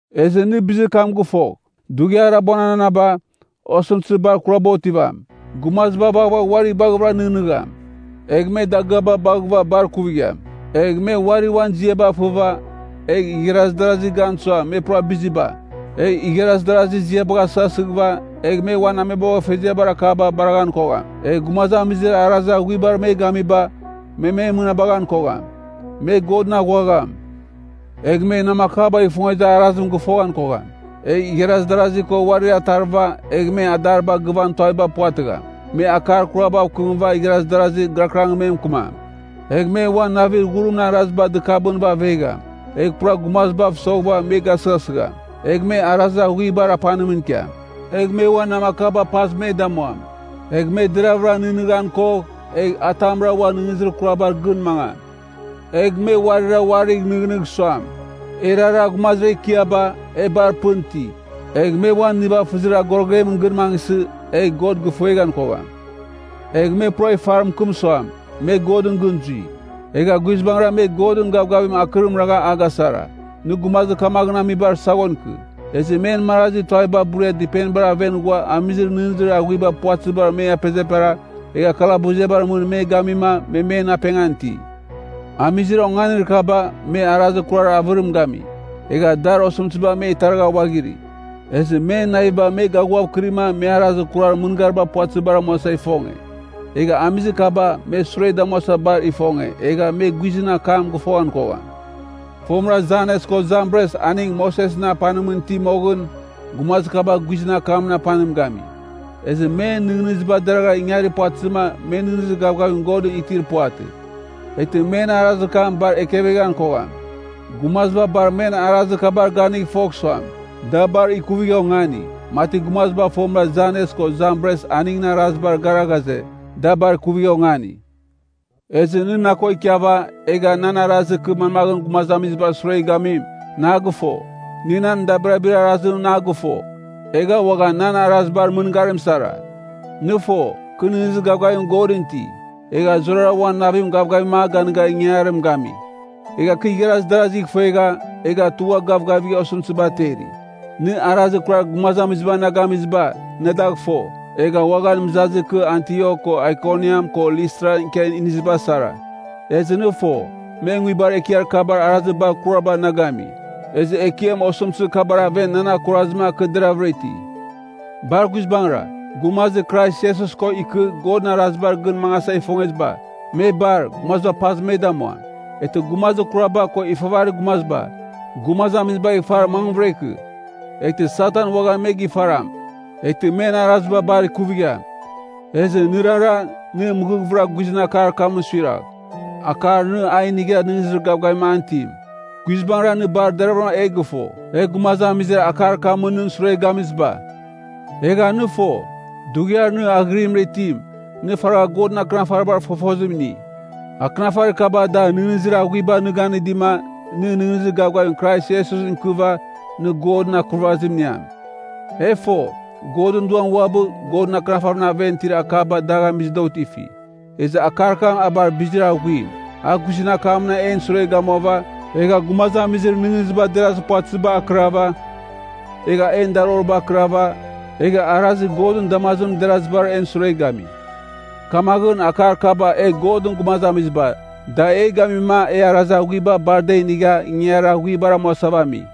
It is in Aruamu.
Ezɨ nɨ bizir kam gɨfogh, Dughiar Abuananaba, osɨmtɨzir bar kuraba otivam. Gumaziba vaghvagh uari baghɨvɨra nɨghnɨgham, egh me dagɨaba baghɨva bar kuvigham. Egh me uari uan ziaba fɨva, egh igharaz darazir gan suam me pura biziba, egh igharaz darazir ziaba gasɨghasɨghɨva, egh me uan ameboghfeziabar akaba baraghan kogham. Egh gumazamizir arazir aghuibar me gamiba, me me mɨnabaghan kogham. Me Godɨn aghuagham. Egh me namakabagh ifongezir arazim gɨfogham kogham. Egh igharaz darasi ko uarir atarɨva, egh me adariba gɨvan tuaviba puvatɨgham. Me akar kurabav kɨmɨva igharaz darazi gɨrakɨrangɨn me mɨkɨmam. Egh me uan navir ghurimɨn araziba dɨkabɨnɨva avegham, egh pura gumazibav soghɨva me gasɨghasɨgham. Egh me arazir aghuibar apanimɨn ikiam. Egh me uan namakaba paz me damuam. Egh me deraghvɨra nɨghnɨghan kogh, egh atamra uan nɨghnɨzir kurabar gɨn mangam. Egh me uarira uarigh nɨghnɨgh suam, erara gumazir ekiaba, e bar pɨn iti. Egh me uan nivafɨzir agorogebar gɨn mangɨsɨ, egh God gɨfueghan kogham. Egh me pura ifar mɨkɨm suam, me Godɨn gɨn zui. Egha guizbangɨra me Godɨn gavgavim akɨrim ragha a gasara. Nɨ gumazir kamaghɨn amibar saghon ikɨ. Ezɨ men marazi tuaviba buria dɨpenibar aven ghua amizir nɨghnɨzir aghuiba puvatɨzibar me apezepera, egh kalabuziabar mɨn me gamima me men apengan iti. Amizir onganir kaba me arazir kurar avɨrim gami, egha dar osɨmtɨziba me taragha uaghiri. Ezɨ men naviba me gaghuavkɨrima me arazir kurar mɨngariba puvatɨzibar amuasa ifonge. Egha amizir kaba me sure damuasa bar ifonge, egha me guizɨn akam gɨfoghan kogham. Fomɨra Janes ko Jambres aning Mosesɨn apanimɨn iti moghɨn, gumazir kaba guizɨn akamɨn apanim gami. Ezɨ men nɨghnɨziba deragha ingarir puvatɨzɨma me nɨghnɨzir gavgavim Godɨn itir puvatɨ. Eghtɨ men arazir kam bar ekevegham kogham. Gumaziba bar men arazir kabar ganigh fogh suam, da bar ikuvigha ongani, mati gumaziba fomɨra Janes ko Jambres aningɨn arazibar gara ghaze, da bar ikuvigha ongani. Ezɨ nɨ na ko ikiava, egha nan arazir kɨ manmaghɨn gumazamizibar sure gamim, nɨ a gɨfo. Nɨ nan dabirabir arazim nɨ a gɨfo, egha uaghan nan arazibar mɨngarim sara. Nɨ fo, kɨ nɨghnɨzir gavgavim Godɨn iti, egha zurara uan navim gavgavim a ganɨga ingangarim gami. Egha kɨ igharaz darazigh ifuegha, egha tugha gavgavigha osɨmtɨziba ateri. Nɨ arazir kurar gumazamiziba na gamiziba, nɨ dagh fo, egha uaghan mɨzazir kɨ Antiok ko Aikoniam ko Listran ikia iniziba sara. Ezɨ nɨ fo, me nguibar ekiar kabar arazir bar kurabar na gami. Ezɨ Ekiam osɨmtɨzir kabar aven nan akurazɨma kɨ deravɨra iti. Bar guizbangɨra, gumazir Krais Iesus ko ikɨ Godɨn arazibar gɨn mangasa ifongeziba, me bar, gumaziba pazɨ me damuam. Eghtɨ gumazir kuraba ko ifavarir gumaziba, gumazamizibagh ifar mangvɨra ikɨ. Eghtɨ Satan uaghan me gifaram, eghtɨ men araziba bar kuvigham. Ezɨ nɨrara, nɨ mɨghɨvɨra guizɨn akar kamɨn suiragh, akar nɨ a inigha nɨghnɨzir gavgavim an itim. Guizbangɨra, nɨ bar deravɨra e gɨfo, e gumazamizir akar kamɨn nɨn sure gamiziba. Egha nɨ fo, dughiar nɨ aghɨrimɨra itim, nɨ faragha Godɨn Akɨnafaribar fofozim ini. Akɨnafarir kaba da nɨghnɨzir aghuiba nɨ ganɨdima, nɨ nɨghnɨzir gavgavim Krais Iesusɨn ikɨva, nɨ Godɨn Akurvazim iniam. E fo, Godɨn Duam uabɨ, Godɨn Akɨnafarimɨn aven itir akaba dagh amizɨ da otifi. Ezɨ akar kam a bar bizir aghuim, a guizɨn akamɨn en sure gamuava, egha gumazamizir nɨghnɨziba derazir puvatɨzibar akɨrava, egha en daroriba akɨrava, egha arazir Godɨn damazimɨn derazibar en sure gami. Kamaghɨn, akar kaba e Godɨn gumazamiziba, da e gamima e arazir aghuiba bar da inigha ingangarir aghuibar amuasava ami.